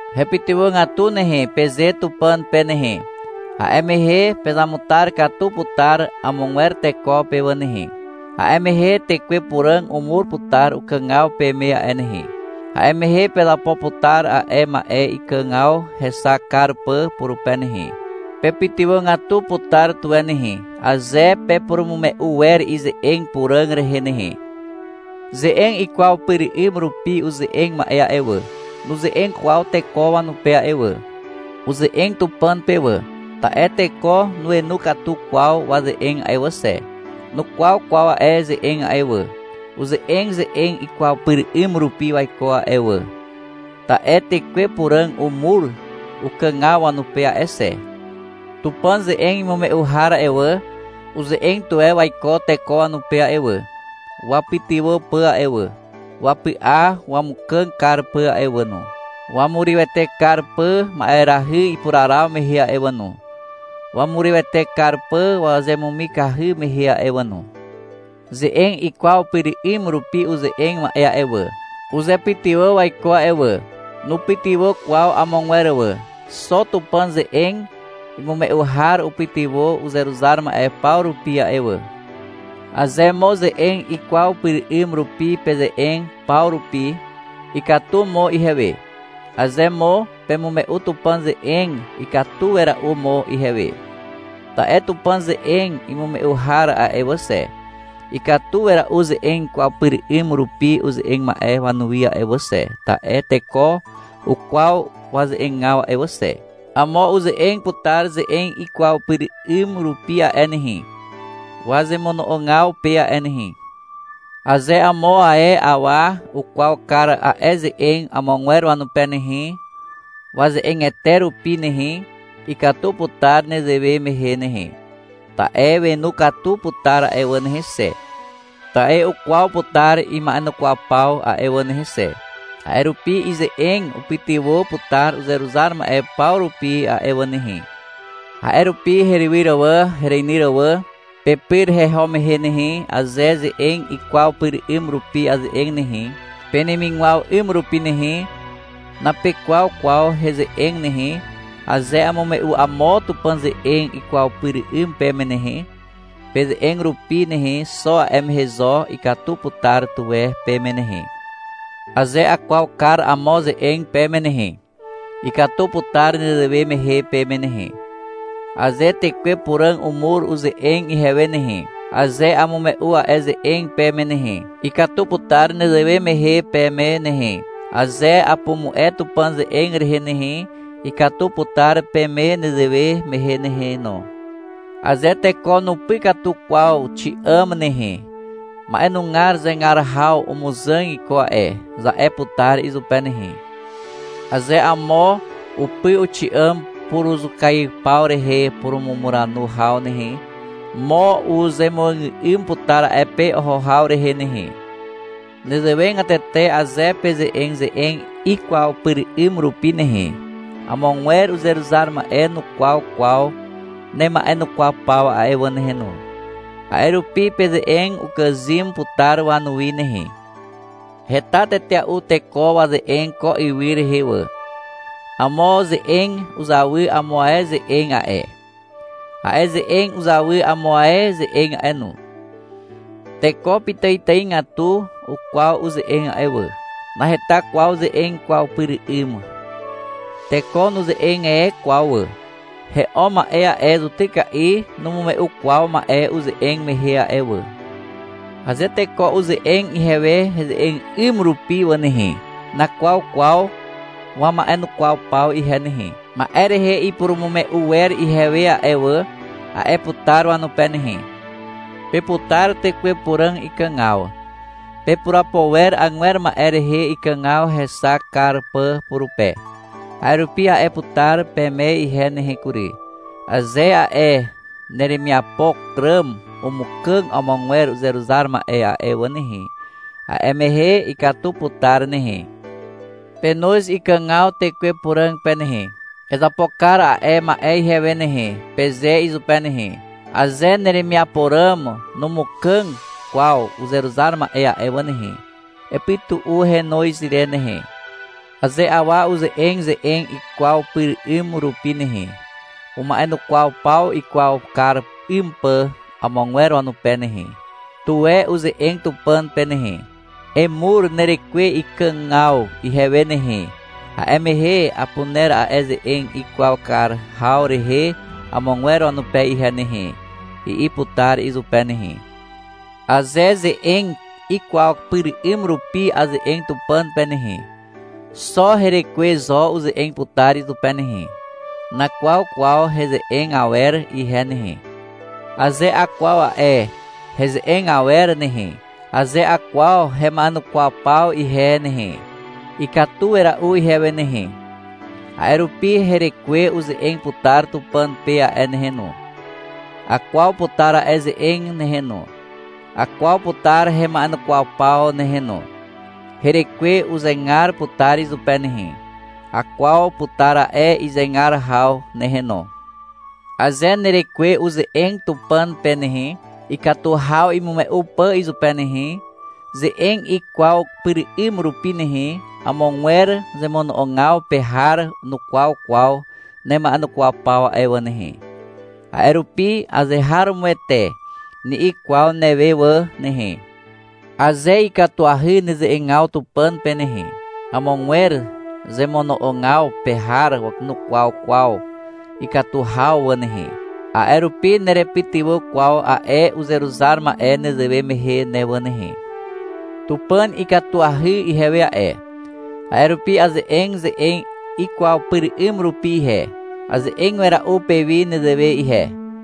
— Hepytywàgatu nehe, peze Tupàn pe nehe. A'e mehe pezamutar katu putar amogwer teko pe wà nehe. A'e mehe Tekwe Puràg umur putar ukàgaw peme a'e nehe. A'e mehe pezapo putar a'e ma'e ikàgaw hexak kar pà purupe nehe. Pepytywàgatu putar tuwe nehe, aze pepurumume'u wer ize'eg puràg rehe nehe. Ze'eg ikwaw pyr 'ym rupi uze'eg ma'e a'e wà, nuze'eg kwaw teko wanupe a'e wà. Uze'eg Tupàn pe wà, ta'e teko nuenu katu kwaw waze'eg a'e wà xe. Nukwaw kwaw a'e ze'eg a'e wà. Uze'eg ze'eg ikwaw pyr 'ym rupi waiko a'e wà, ta'e Tekwe Puràg umur ukàgaw wanupe a'e xe. Tupàn ze'eg imume'u har a'e wà, uze'eg tuwe waiko teko wanupe a'e wà, wapytywà pà a'e wà, wapy'a wamukàg kar pà a'e wà no, wamurywete kar pà ma'erahy ipuraraw mehe a'e wà no, wamurywete kar pà wazemumikahy mehe a'e wà no. Ze'eg ikwaw pyr 'ym rupi uze'eg ma'e a'e wà, uzepytywà waiko a'e wà. Nupytywà kwaw amogwer wà. Xo Tupàn ze'eg imume'u har upytywà uzeruzar ma'e paw rupi a'e wà. Aze mo ze'eg ikwaw pyr 'ym rupi peze'eg paw rupi, ikatu mo ihewe. Aze mo pemume'u Tupàn ze'eg, ikatu wera'u mo ihewe. Ta'e Tupàn ze'eg imume'u har a'e wà xe, ikatu wera'u ze'eg ikwaw pyr 'ym rupi uze'eg ma'e wanuwi a'e wà xe, ta'e teko ukwaw waze'egaw a'e wà xe. Amo uze'eg putar ze'eg ikwaw pyr 'ym rupi a'e nehe, wazemono'ogaw pe a'e nehe. Aze amo ae awa ukwaw kar a'e ze'eg amogwer wanupe nehe, waze'egete rupi nehe, ikatu putar nezewe mehe nehe. Ta'e wenu katu putar a'e wà nehe xe. Ta'e ukwaw putar ima'enukwaw paw a'e wà nehe xe. A'e rupi ize'eg upytywà putar uzeruzar ma'e paw rupi a'e wà nehe. A'e rupi herywyr wà, hereinyr wà, pepyr heho mehe nehe, aze ze'eg ikwaw pyr 'ym rupi aze'eg nehe, penemigwaw 'ym rupi nehe, napekwaw kwaw heze'eg nehe. Aze amume'u amo Tupàn ze'eg ikwaw pyr 'ym peme nehe, peze'eg rupi nehe, xo a'e mehe zo ikatu putar tuwe peme nehe. Aze akwaw kar amo ze'eg peme nehe, ikatu putar nezewe mehe peme nehe. Aze Tekwe Puràg umur uze'eg ihewe nehe, aze amume'u a'e ze'eg peme nehe, ikatu putar nezewe mehe peme nehe. Aze apumu'e Tupàn ze'eg rehe nehe, ikatu putar peme nezewe mehe nehe no. Aze teko nupy katu kwaw xi'àm nehe, — Ma'enugar zegar haw umuzàg iko a'e, za'e putar izupe nehe. Aze amo upy uxi'àm puruzukaiw paw rehe purumumuranu haw nehe, mo uzemuàgà'ym putar a'e pe oho haw rehe nehe. Nezewegatete aze peze'eg ze'eg ikwaw pyr 'ym rupi nehe, amogwer uzeruzar ma'e nukwaw kwaw nema'enukwaw paw a'e wà nehe no. A'e rupi peze'eg ukàzym putar wanuwi nehe. Heta tetea'u teko waze'eg ko ywy rehe wà. Amo ze'eg uzawy amo ae ze'eg a'e. A'e ze'eg uzawy amo ae ze'eg a'e no. Teko pitàitàigatu ukwaw uze'eg a'e wà. Naheta kwaw ze'eg ikwaw pyr 'ym. Teko nuze'eg e kwaw wà. He'o ma'e a'e zutyka'i numume'u kwaw ma'e uze'eg mehe a'e wà. Aze teko uze'eg ihewe heze'eg 'ym rupi wà nehe, nakwaw kwaw wama'enukwaw paw ihe nehe. Ma'e rehe ipurumume'u wer ihewe a'e wà, a'e putar wanupe nehe. Peputar Tekwe Puràg ikàgaw. Pepurapo wer agwer ma'e rehe ikàgaw hexak kar pà purupe. A'e rupi a'e putar peme ihe nehe kury. Aze a'e neremiapo ràm umukàg amogwer uzeruzar ma'e a'e wà nehe, a'e mehe ikatu putar nehe. Penoz ikàgaw Tekwe Puràg pe nehe. — Ezapo kar a'e ma'e ihewe nehe, peze izupe nehe. Aze neremiapo ràm numukàg kwaw uzeruzar ma'e a'e wà nehe, epytu'u henoz re nehe. Aze awa uze'eg ze'eg ikwaw pyr 'ym rupi nehe, uma'enukwaw paw ikwaw kar 'ym pà amogwer wanupe nehe, tuwe uze'eg Tupàn pe nehe. — Emur nerekwe ikàgaw ihewe nehe. A'e mehe apuner a'e ze'eg ikwaw kar haw rehe amogwer wanupe ihe nehe, i'i putar izupe nehe. Aze ze'eg ikwaw pyr 'ym rupi aze'eg Tupàn pe nehe, xo herekwe zo uze'eg putar izupe nehe. Nakwaw kwaw heze'eg awer ihe nehe. Aze akwaw a'e heze'eg awer nehe, aze akwaw hema'enukwaw paw ihe nehe, ikatu wera'u ihewe nehe. A'e rupi herekwe uze'eg putar Tupàn pe a'e nehe no. Akwaw putar a'e ze'eg nehe no, akwaw putar hema'enukwaw paw nehe no. Herekwe uzegar putar izupe nehe. Akwaw putar a'e izegar haw nehe no. Aze nerekwe uze'eg Tupàn pe nehe, ikatu haw imume'u pà izupe nehe, ze'eg ikwaw pyr 'ym rupi nehe, amogwer zemono'ogaw pe har nukwaw kwaw nema'enukwaw paw a'e wà nehe. A'e rupi — Azeharomoete, ni'i kwaw newe wà nehe. Aze ikatuahy neze'egaw Tupàn pe nehe, amogwer zemono'ogaw pe har nukwaw kwaw ikatu haw wà nehe, a'e rupi nerepytywà kwaw a'e uzeruzar ma'e nezewe mehe ne wà nehe. Tupàn ikatuahy ihewe a'e, a'e rupi aze'eg ze'eg ikwaw pyr 'ym rupi ihe. Aze'eg wera'u pewi nezewe ihe.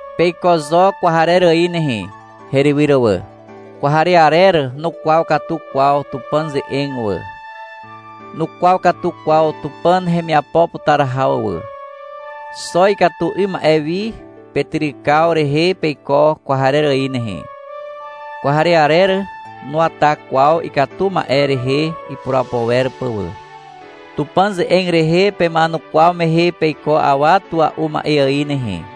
Peiko zo kwarer ài nehe, herywyr wà. Kwarearer nukwaw katu kwaw Tupàn ze'eg wà. Nukwaw katu kwaw Tupàn hemiapo putar haw wà. Xo ikatu 'ym ma'e wi petyrykaw rehe peiko kwarer ài nehe. Kwarearer nuwata kwaw ikatu 'ym ma'e rehe ipurapo wer pà wà. Tupàn ze'eg rehe pema'enukwaw mehe peiko awa tua'u ma'e ài nehe.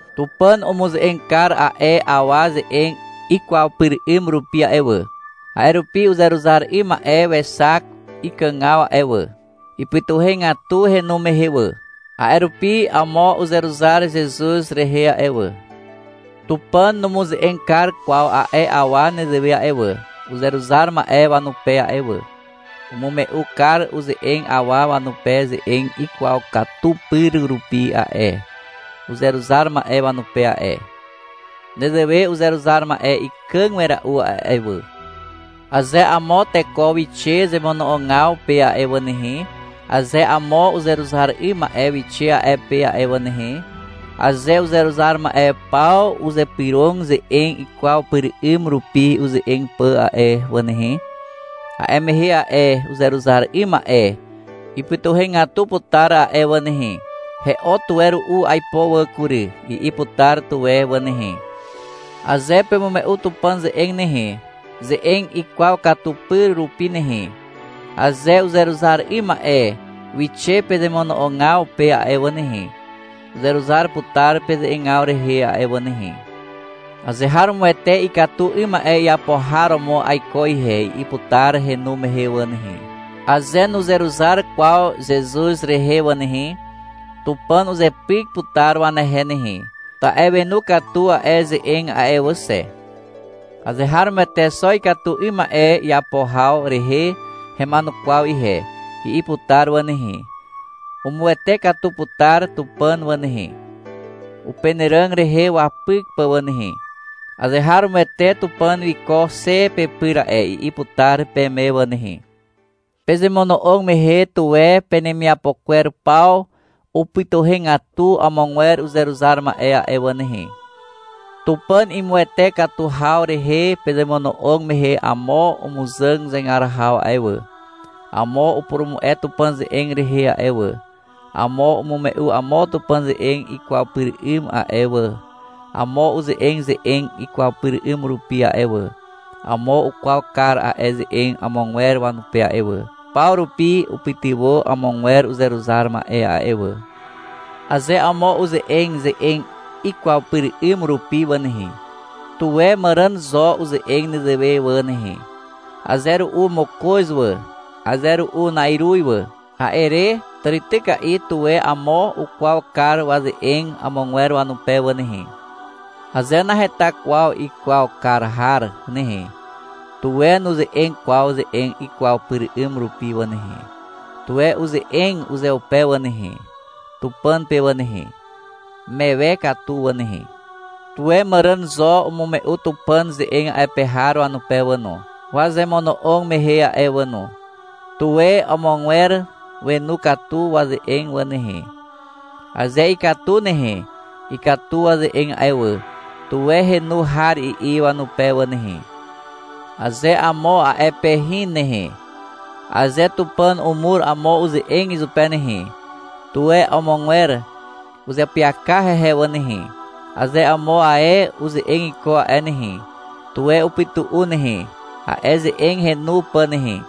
Tupàn umuze'eg kar a'e awa ze'eg ikwaw pyr 'ym rupi a'e wà. A'e rupi uzeruzar 'ym ma'e wexak ikàgaw a'e wà. Ipytuhegatu henu mehe wà. (A'e rupi amo uzeruzar Zezuz rehe a'e wà.) Tupàn numuze'eg kar kwaw a'e awa nezewe a'e wà, uzeruzar ma'e wanupe a'e wà. Umume'u kar uze'eg awa wanupe ze'eg ikwaw katu pyr rupi a'e, uzeruzar ma'e wanupe a'e. Nezewe uzeruzar ma'e ikàg wera'u a'e wà. Aze amo teko wixe zemono'ogaw pe a'e wà nehe, aze amo uzeruzar 'ym ma'e wixe a'e pe a'e wà nehe, aze uzeruzar ma'e paw uzypyrog ze'eg ikwaw pyr 'ym rupi uze'eg pà a'e wà nehe, a'e mehe a'e uzeruzar 'ym ma'e ipytuhegatu putar a'e wà nehe. — He'o tuwe ru'u aipo wà kury, i'i putar tuwe wà nehe. Aze pemume'u Tupàn ze'eg nehe, ze'eg ikwaw katu pyr rupi nehe, aze uzeruzar 'ym ma'e wixe pezemono'ogaw pe a'e wà nehe, uzeruzar putar peze'egaw rehe a'e wà nehe. — Azeharomoete ikatu 'ym ma'e iapo har romo aiko ihe, i'i putar henu mehe wà nehe. Aze nuzeruzar kwaw Zezuz rehe wà nehe, Tupàn uzepyk putar wanehe nehe, ta'e wenu katu a'e ze'eg a'e wà xe. — Azeharomoete xo ikatu 'ym ma'e iapo haw rehe hema'enukwaw ihe, i'i putar wà nehe. Umuwete katu putar Tupàn wà nehe, upenàràg rehe wapyk pà wà nehe. — Azeharomoete Tupàn wiko xe pepyr a'e, i'i putar peme wà nehe. Pezemono'og mehe, tuwe penemiapo kwer paw upytywàgatu amogwer uzeruzar ma'e a'e wà nehe. Tupàn imuwete katu haw rehe pezemono'og mehe amo umuzàg zegar haw a'e wà, amo upurumu'e Tupàn ze'eg rehe a'e wà, amo umume'u amo Tupàn ze'eg ikwaw pyr 'ym a'e wà, amo uze'eg ze'eg ikwaw pyr 'ym rupi a'e wà, amo ukwaw kar a'e ze'eg amogwer wanupe a'e wà. Paw rupi upytywà amogwer uzeruzar ma'e a'e wà. Aze amo uze'eg ze'eg ikwaw pyr 'ym rupi wà nehe, tuwe màràn zo uze'eg nezewe wà nehe, — Aze ru'u mokoz wà, aze ru'u na'iruz wà. A'e re, tàrityka'i, tuwe amo ukwaw kar waze'eg amogwer wanupe wà nehe. Aze naheta kwaw ikwaw kar har nehe, tuwe nuze'eg kwaw ze'eg ikwaw pyr 'ym rupi wà nehe. Tuwe uze'eg uzeupe wà nehe, Tupàn pe wà nehe, mewe katu wà nehe. Tuwe màràn zo umume'u Tupàn ze'eg a'e pe har wanupe wà no, wazemono'og mehe a'e wà no. Tuwe amogwer wenu katu waze'eg wà nehe. Aze ikatu nehe, — Ikatu waze'eg a'e wà, tuwe henu har i'i wanupe wà nehe. Aze amo a'e pe hin nehe, aze Tupàn umur amo uze'eg izupe nehe, tuwe amogwer uzeapyaka hehe wà nehe. Aze amo ae uze'eg iko a'e nehe, tuwe upytu'u nehe, a'e ze'eg henu pà nehe.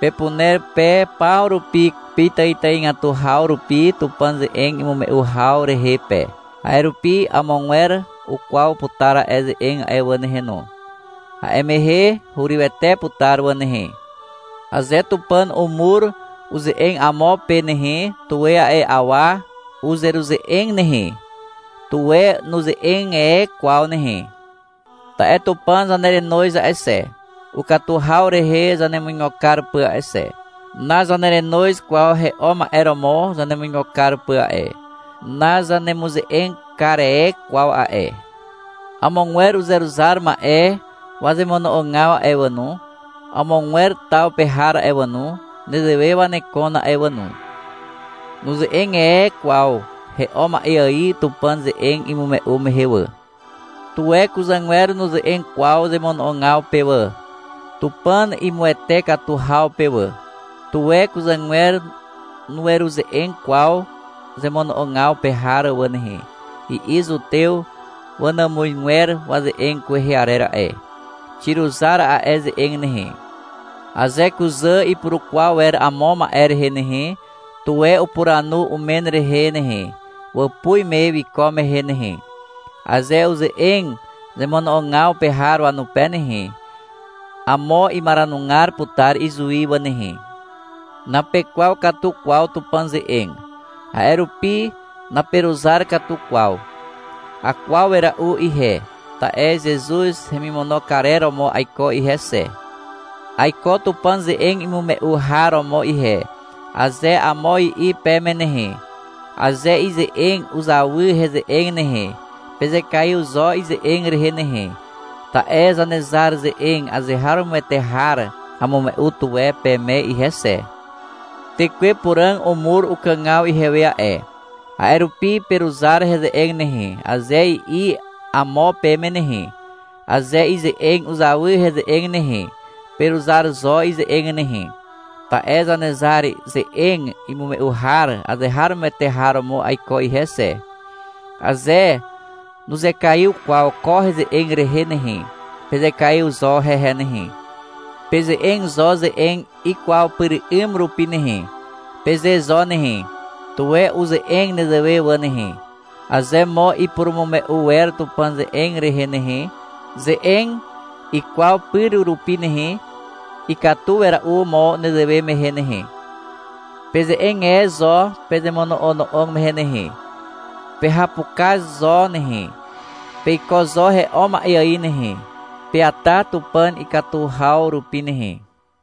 Pepuner pe paw rupi, pitàitàigatu haw rupi Tupàn ze'eg imume'u haw rehe pe. A'e rupi amogwer ukwaw putar a'e ze'eg a'e wà nehe no. A'e mehe hurywete putar wà nehe. Aze Tupàn umur uze'eg amo pe nehe, tuwe a'e awa uzeruze'eg nehe. Tuwe nuze'eg e kwaw nehe. Ta'e Tupàn zanerenoz a'e xe, ukatu haw rehe zanemuigo kar pà a'e xe. Nazanerenoz kwaw he'o ma'e romo zanemuigo kar pà a'e. Nazanemuze'eg kar e kwaw a'e. Amogwer uzeruzar ma'e wazemono'ogaw a'e wà no, amogwer taw pe har a'e wà no, nezewe wanekon a'e wà no. Nuze'eg e kwaw he'o ma'e ài Tupàn ze'eg imume'u mehe wà. Tuwe kuzàgwer nuze'eg kwaw zemono'ogaw pe wà, Tupàn imuwete katu haw pe wà. — Tuwe kuzàgwer nueruze'eg kwaw zemono'ogaw pe har wà nehe, i'i zutew wanàmuzgwer waze'eg kwehe arer a'e. Xiruzar a'e ze'eg nehe. Aze kuzà ipurukwaw wer amo ma'e rehe nehe, tuwe upuranu umen rehe nehe, wàpuz me wiko mehe nehe. Aze uze'eg zemono'ogaw pe har wanupe nehe, amo imaranugar putar izuwi wà nehe. Napekwaw katu kwaw Tupàn ze'eg. A'e rupi naperuzar katu kwaw. (Akwaw wera'u ihe, ta'e Zezuz hemimono karer romo aiko ihe xe.) — Aiko Tupàn ze'eg imume'u har romo ihe, aze amo i'i peme nehe, aze ize'eg uzawy heze'eg nehe, pezekaiw zo ize'eg rehe nehe, ta'e Zanezar ze'eg azeharomoete har amume'u tuwe peme ihe xe. — Tekwe Puràg umur ukàgaw ihewe a'e, a'e rupi peruzar heze'eg nehe, aze i'i amo peme nehe, aze ize'eg uzawy heze'eg nehe, peruzar zo ize'eg nehe, ta'e Zanezar ze'eg imume'u har azeharomoete har romo aiko ihe xe. Aze nuzekaiw kwaw ko heze'eg rehe nehe, pezekaiw zo hehe nehe. — Peze'eg zo ze'eg ikwaw pyr 'ym rupi nehe, peze zo nehe. Tuwe uze'eg nezewe wà nehe. Aze mo ipurumume'u wer Tupàn ze'eg rehe nehe, ze'eg ikwaw pyr rupi nehe, ikatu wera'u mo nezewe mehe nehe. Peze'eg e zo pezemono'ono'og mehe nehe. Pehapukaz zo nehe. Peiko zo he'o ma'e ài nehe. Peata Tupàn ikatu haw rupi nehe.